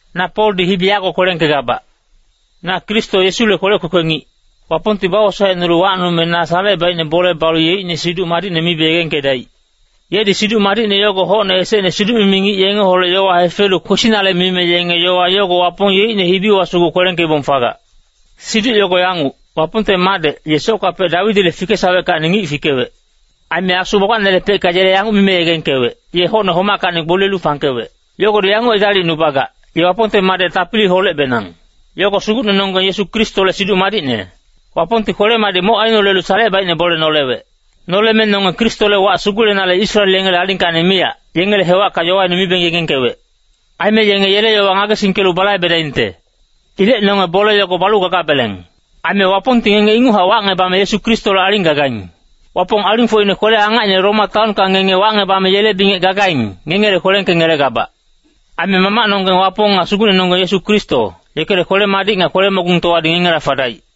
Na Poldi hibi yago kwelengkegabac. Na Kristo Yesule kwelec kwekwe ngic. Wapongti bawosaecnulu wacnume na salecebaicne bole balu yeicne Siduc Madicne mibe yegengkedaic. Yedi Siduc Madicne yogo hocne esecne siduc-mimi ngic yengeholec yowa hefelu kwesinale mime yenge yowa yogo Wapong yeicne hibiwa sugu kwelengkeibong fagac. Siduc yogo yanguc, Wapongte Madec, ye soctepecka Dawidile fikesaweckacni ngic fikewec. Aime asu gbagbacnelepecka yele yanguc mime yegengkewec, ye hocne homackacni gboliyelu fangkewec. Yogodi yanguc edalicnubagac, ye Wapongte Madec tapiliholecbenang. Yogo Sugucnenonggeng Yesu Kristole Siduc Madicne. Wapongti kwele-madic moc ainolelu salecebaicne bole nolewec. Noleme nonge Kristole wac sugulenale Israel yengele alingkacni miyac, yengele hewacka yowaine mibeng yegengkewec. Aime yenge yele yowa ngagesingkelu balaibedaingte. Ilec nonge bole yogo balu gagabeleng. Aime Wapongti ngenge inguchac wacngebame Yesu Kristole aling aigaing. Wapong alingfocine kwele-angacine Roma taonka ngenge wacngebame yele bingec gagaing, ngengele kwelengkengelegabac. Aime Mamacnonggeng Wapong nga Sugucnenonggeng Yesu Kristo, yekele kwele-madic nga kwele-mogungtowadi ngengela fadaic.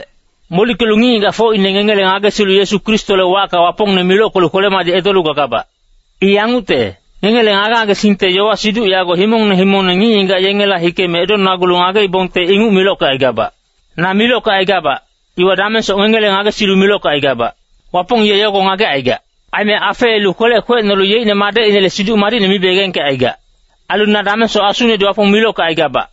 Molickelu ngic-ngigacfocine ngengele ngagesilu Yesu Kristole wacka Wapongne milockelu kwele-madic edolu gagabac. I yangucte, ngengele ngage-ngagesingte yowa-siduc yogo himongne himongne ngic-ngigac yengela hikeme edonagulu ngageibongte inguc milockecaigabac. Na milockecaigabac, iwa damengsoc ngengele ngagesilu milockecaigabac. Wapong ye yogo ngagecaigac. Aime afeelu kwelec kwecnolu yeicne Madecinele Siduc Madicne mibe yegengkecaigac. Ailu na damengsoc asunedi Wapong milockecaigabac.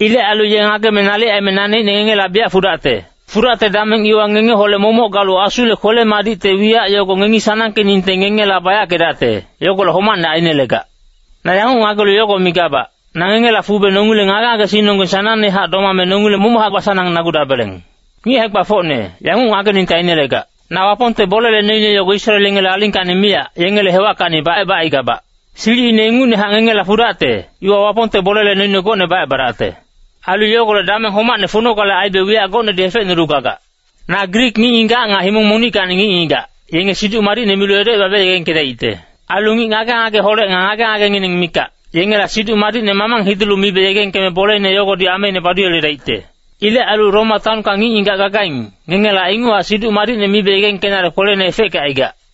Ilec ailu ye ngageme nalic aime naneicne ngengela biyac fudacte. Fudacte dameng iwa ngengeholec momoc galu asule kwele-madicte wiyac yogo ngengi sanangkeningte ngengela bayackedacte, yogolec homacne ainelegac. Na yanguc ngagelu yogo migabac, na ngengela fube nongileng ngage-ngagesingnonggeng sanangnehac domame nongileng momochac basanang-nagudabeleng. Ngic hae-gbafocne, yanguc ngageningte ainelegac. Na Wapongte bolele noine yogo Israel yengele alingkacni miyac, yengele hewackacni bacebacaigabac. Silicine ingucnehac ngengela fudacte, iwa Wapongte bolele noine gocne bacebadacte. Ailu yogolec dameng homacne funogale aibe wiyac gocnedi hefecnulu gagac. Na Grik ngic-ngigac nga himong monickacni ngic-ngigac, yenge Siduc Madicne milu edocebabe yegengkedaicte. Ailu ngic ngage-ngageholec nga ngage-ngagengineng mikac, yengela Siduc Madicne mamang hidulu mibe yegengkeme bolene yogodi ameine baduyeledaicte. Ilec ailu Roma taonka ngic-ngigac gagaing, ngengela inguchac Siduc Madicne mibe yegengkenale kwelene efeckecaigac.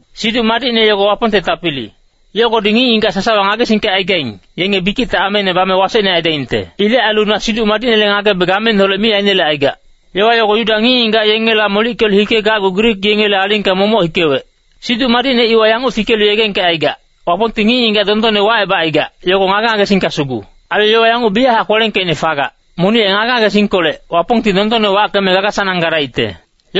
Siduc Madicne yogo Wapongte tapili. Yogodi ngic-ngigac sasawa ngagesingkecaigaing, yenge bikicte ameine bame wasecne aidaingte. Ilec ailu na Siduc Madicnele ngagebe gameineholec mi ainelecaigac. Yowa yogo Yuda ngic-ngigac yengela molickelu hikegacgu Grik yengele alingka momoc hikewec. Siduc Madicne iwa yanguc fikelu yegengkecaigac, Wapongti ngic-ngigac dondonne wacebacaigac, yogo ngage-ngagesingka sugu. Ailu yowa yanguc biyachac kwelengkeicne fagac, “Monic ye ngage-ngagesingkolec, Wapongti dondonne wackeme gaga-sanang gadaicte.”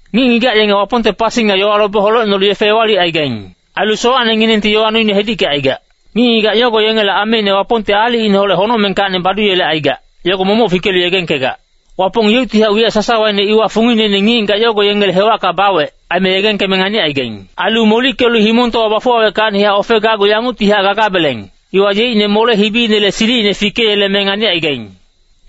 Ngic-ngigac yenge Wapongte pasi nga yowa lobe holecnolu yefe ewalicaigaing. Ailu sowacnenginengti yowa noine hedickecaigac. Ngic-ngigac yogo yengele ameine Wapongti aalicineholec honocmengkacni baduyelecaigac, yogo momoc fikelu yegengkegac. Wapong yeuctihac wiyac sasawaine iwa fungineine ngic-ngigac yogo yengele hewacka bawec, aime yegengkeme nganicaigaing. Ailu molickelu himongtowa bafuwaweckacnihac ofegacgu yanguctihac gagabeleng, iwa yeicne mole-hibile silicine fikeyeleme nganicaigaing.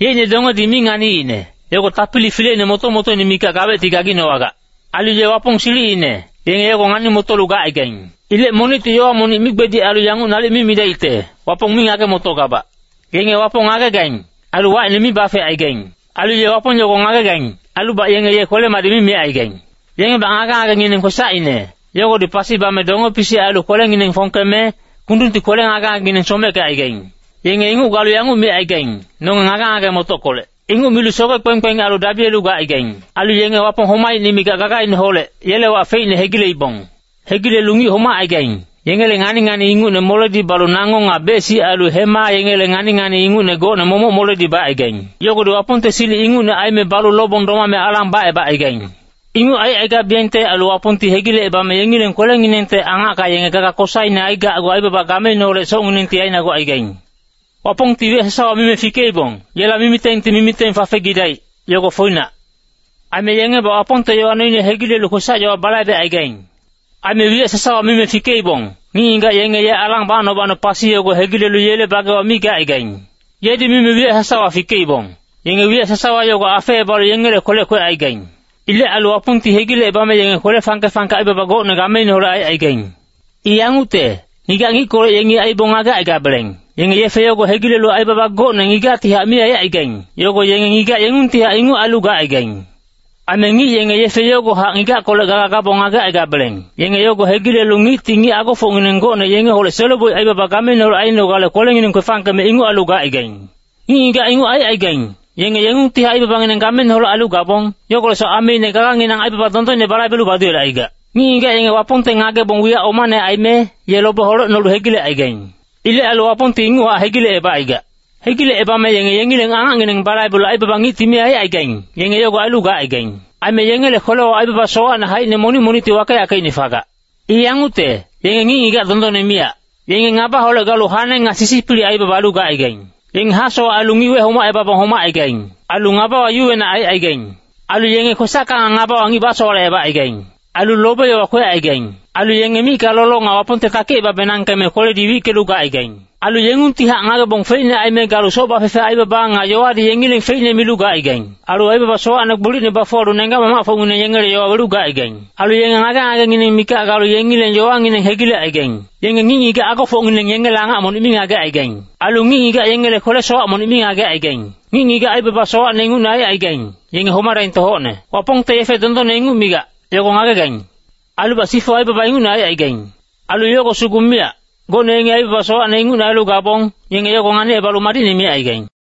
Yeicne dongedi mi nganiicne, yogo tapili fileine moto-motoine mikac gawecti gaginowagac. Ailu ye Wapong silicine, yenge yogo ngani-motolu gacaigaing. Ilec monicti yowa monic migbedic ailu yanguc nalic mi midaicte, “Wapong mi ngage-motogabac.” Yenge Wapong ngagegaing, ailu wacine mi bafecaigaing. Ailu ye Wapong yogo ngagegaing, ailubac yenge ye kwele-madic mi micaigaing. Yengebac ngage-ngagengineng kwesacine, yogodi pasi bame donge-pisic ailu kwelengineng fongkeme, kundungti kwele ngage-ngagengineng someckecaigaing. Yenge inguc galu yanguc micaigaing, “Nonge ngage-ngage-motockolec.” Inguc milu soge-kpekpeng ailu dabiyelu gacaigaing. Ailu yenge Wapong homacine mikac gagaineholec, yele wac feicne hegileibong. Hegilelu ngic homacaigaing, yengele ngani-ngani ingucne moledi balu nango nga bec-sic ailu hema yengele ngani-ngani ingucne gocne momoc moledi bacaigaing. Yogodi Wapongte silic ingucne aime balu lobong domame alang bacebacaigaing. Inguc aicaigabiyengte ailu Wapongti hegilecebame yengileng kwelenginengte angacka yenge gaga kosaine aigacgu aibaba gameineholec socnginengti ainagucaigaing. Wapongti wiyac sasawa mime fikeibong, yela mimitengti mimiteng fafegidaic, yogo foinac. Aime yengebac Wapongte yowa noine hegilelu kwesac-yowa balaibecaigaing. Aime wiyac sasawa mime fikeibong, ngic-ngigac yenge ye alang bacno-bacno pasi yogo hegilelu yele bagewa mi gacaigaing. Yedi mime wiyac sasawa fikeibong, yenge wiyac sasawa yogo afeebalu yengele kwelec kwecaigaing. Ilec ailu Wapongti hegilecebame yenge kwele fangke-fangke aibaba gocne gameineholec aicaigaing. I yangucte, ngigac ngickolec yengi aibong ngagecaigabeleng, yenge yefe yogo hegilelu aibaba gocne ngigactihac mi aicaigaing, yogo yenge ngigac yengungtihac inguc ailu gacaigaing. Aime ngic yenge yefe yogohac ngigackolec gaga gabong ngagecaigabeleng, yenge yogo hegilelu ngicti ngic agofocngineng gocne yengeholec selo-boic aibaba gameineholec ainogale kwelengineng kwefangkeme inguc ailu gacaigaing. Ngic-ngigac inguc aicaigaing, yenge yengungtihac aibabangineng gameineholec ailu gabong, yogolecsoc ameine gaganginang aibaba dondonne balaibelu baduyelecaigac. Ngic-ngigac yenge Wapongte ngagebong wiyac omane aime, ye lobe holecnolu hegilecaigaing. Ilec ailu Wapongti inguchac hegilecebacaigac. Hegilecebame yenge yengileng angacngineng balaibelu aibaba ngicti mi aicaigaing, yenge yogo ailu gacaigaing. Aime yengele kwelewa aibaba sowacne haicine monic monicti wakeyackeicne fagac. I yangucte, yenge ngic-ngigac dondonne miyac. Yenge ngabaholec galu hane nga sisipilic aibaba ailu gacaigaing. Yenge hasowac ailu ngic wecebabong homacaigaing. Ailu ngabawa yuwenac aicaigaing. Ailu yenge kwesacka nga ngabawa ngic basowalecebacaigaing. Ailu lobe-yowa kwecaigaing. Ailu yenge micka lolo nga Wapongte takicebabenangkeme kweledi wickelu gacaigaing. Ailu yengungtihac ngagebong feicne aime galu soc bafefe aibaba nga yowadi yengileng feicne milu gacaigaing. Ailu aibaba sowacne gbolicne bafuwalu nenggac-mamacfocngineng yengele yowa welu gacaigaing. Ailu yenge ngage-ngagengineng mikac galu yengileng yowangineng hegilecaigaing. Yenge ngic-ngigac agofocngineng yengele angac monic mi ngagecaigaing. Ailu ngic-ngigac yengele kwele-sowac monic mi ngagecaigaing. Ngic-ngigac aibaba sowacne ingucne aicaigaing, yenge homadaingte hocne. Wapongti yefe dondonne inguc migac, yogo ngagegaing. Ailubac sifu aibaba ingucne aicaigaing. Ailu yogo sugu miyac, gocne yengi aibaba sowacne ingucne ailu gabong, yenge yogo nganicebalu madicne micaigaing.